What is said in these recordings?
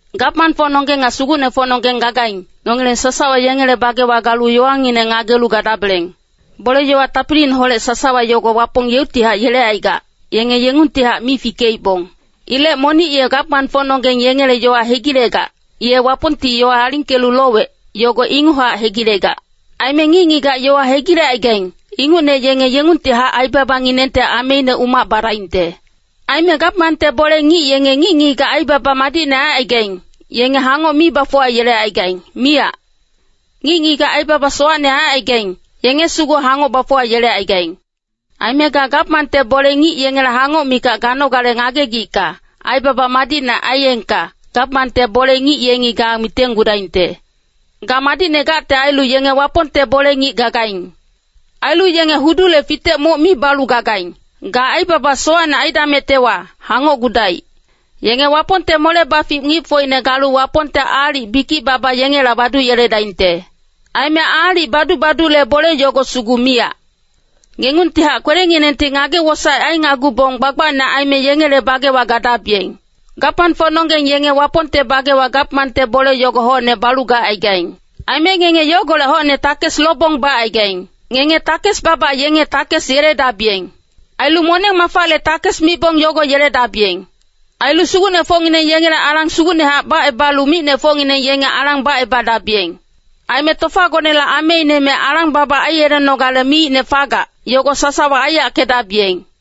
Gamangfocnonggeng nga sugucnefocnonggeng gagaing, nongileng sasawa yengele bagewa galu yowangineng ngagelu gadabeleng. Bole-yowa tapiliineholec sasawa yogo Wapong yeuctihac yelecaigac, yenge yengungtihac mi fikeibong. Ilec monic ye gamangfocnonggeng yengele yowa hegilegac, ye Wapongti yowa alingkelu lowec, yogo inguchac hegilegac. Aime ngic-ngigac yowa hegilecaigaing, ingucne yenge yengungtihac aibabanginengte ameine umac badaingte. Aime gamangte bole-ngic yenge ngic-ngigac aibaba madicne aicaigaing, yenge hangoc mi bafuwayelecaigaing, miyac. Ngic-ngigac aibaba sowacne aicaigaing, yenge sugu hangoc bafuwayelecaigaing. Aime ga gamangte bole-ngic yengele hangoc mikac ganogale ngagegicka, aibaba madicne aiyengka, gamangte bole-ngic yengi ga mitenggudaingte. Ga madicne gacte ailu yenge Wapongte bole-ngic gagaing. Ailu yenge hudule fitec moc mi balu gagaing, ga aibaba sowacne aidamectewa, hangocgudaic. Yenge Wapongte mole-bafic ngicfocine galu Wapongte aalic bikic-baba yengela baduyeledaingte. Aime aalic badu-badule bole yogo sugu miyac. Ngengungtihac kwelenginengti ngage-wosaec ainagubong gbagbacne aime yengele bagewa gadabiyeng. Gamangfocnonggeng yenge Wapongte bagewa gamangte bole yogo hocne balu gacaigaing. Aime ngenge yogolec hocne takes lobong bacaigaing. Ngenge takes-baba yenge takes yeledabiyeng. Ailu moneng-mafale takes mibong yogo yeledabiyeng. Ailu sugucnefocngineng yengele alang sugucnehac bacebalu micnefocngineng yenge alang bacebadabiyeng. Aime tofagonele ameine me alang-baba aiyelenogale miicne fagac, yogo sasawa aiyackedabiyeng!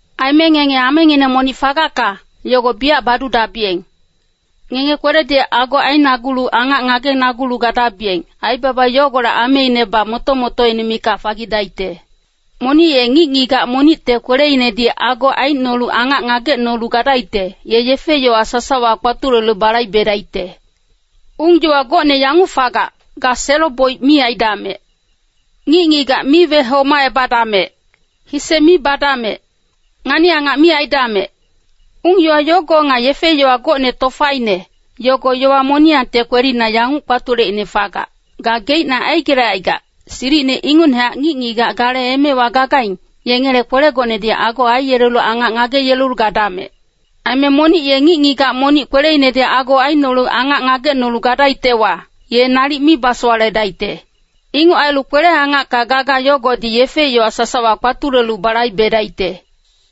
Aime ngenge amengineng monic fagacka, yogo biyac badudabiyeng. Ngenge kweledi ago ainagulu angac ngagenagulu gadabiyeng, aibaba yogolec ameinebac moto-motoine mikac fagidaicte. Monic ye ngic-ngigac monicte kweleinedi ago aicnolu angac ngagecnolu gadaicte, ye yefe-yowa sasawa kpatulelu balaibedaicte. Ung-yowa gocne yanguc fagac, “Ga selo-boic mi aidamec. Ngic-ngigac mi wehomacebadamec. Hise mi badamec. Ngani-angac mi aidamec.” Ung-yowa yogo nga yefe-yowa gocne tofaine, yogo yowa moniyangte kwelina yanguc kpatuleicne fagac, “Gageicne aigelecaigac, silicine ingucnehac ngic-ngigac gale emewa gagaing, yengele kwelegonedi ago aiyelelu angac ngageyelelu gadamec.” Aime monic ye ngic-ngigac monic kweleinedi ago aicnolu angac ngagecnolu gadaictewa, ye nalic mi basowaledaicte. Inguc ailu kwele-angacka gaga yogodi yefe-yowa sasawa kpatulelu balaibedaicte.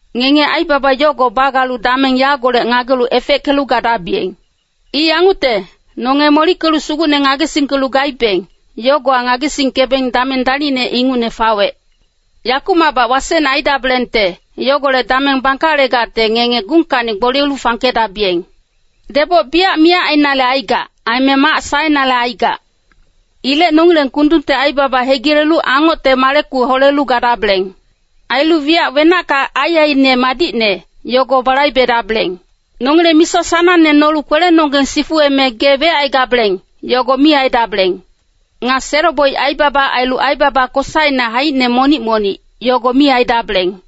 Ngenge aibaba yogo bagalu dameng yagolec ngagelu efeckelu gadabiyeng! I yangucte, nonge molickelu Sugucne ngagesingkelu gaibeng, yogowa ngagesingkebeng dameng dalicne ingucne fawec. Yakumacbac wasecne aidabelengte, yogolec dameng bangkalegacte ngenge gungkacni gboliyelu fangkedabiyeng. Deboc biyac miyac ainale aigac, aime mac saenale aigac. Ilec nongileng kundungte aibaba hegilelu angocte maleku holelu gadabeleng. Ailu wiyac wenacka aiaiine madicne, yogo balaibedabeleng. Nongileng misa sanangne nolu kwelenonggeng sifuweme gee wecaigabeleng, yogo mi aidabeleng. Nga selo-boic aibaba ailu aibaba kosaine haicine monic-monic, yogo mi aidabeleng.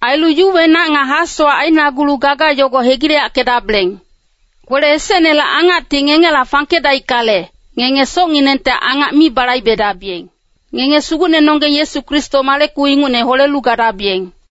Ailu yuwenac nga hasowac ainagulu gaga yogo hegileyackedabeleng. Kwele esecnele angacti ngengela fangkedaickale, ngenge socnginengte angac mi balaibedabiyeng. Ngenge Sugucnenonggeng Yesu Kristo maleku ingucne holelu gadabiyeng.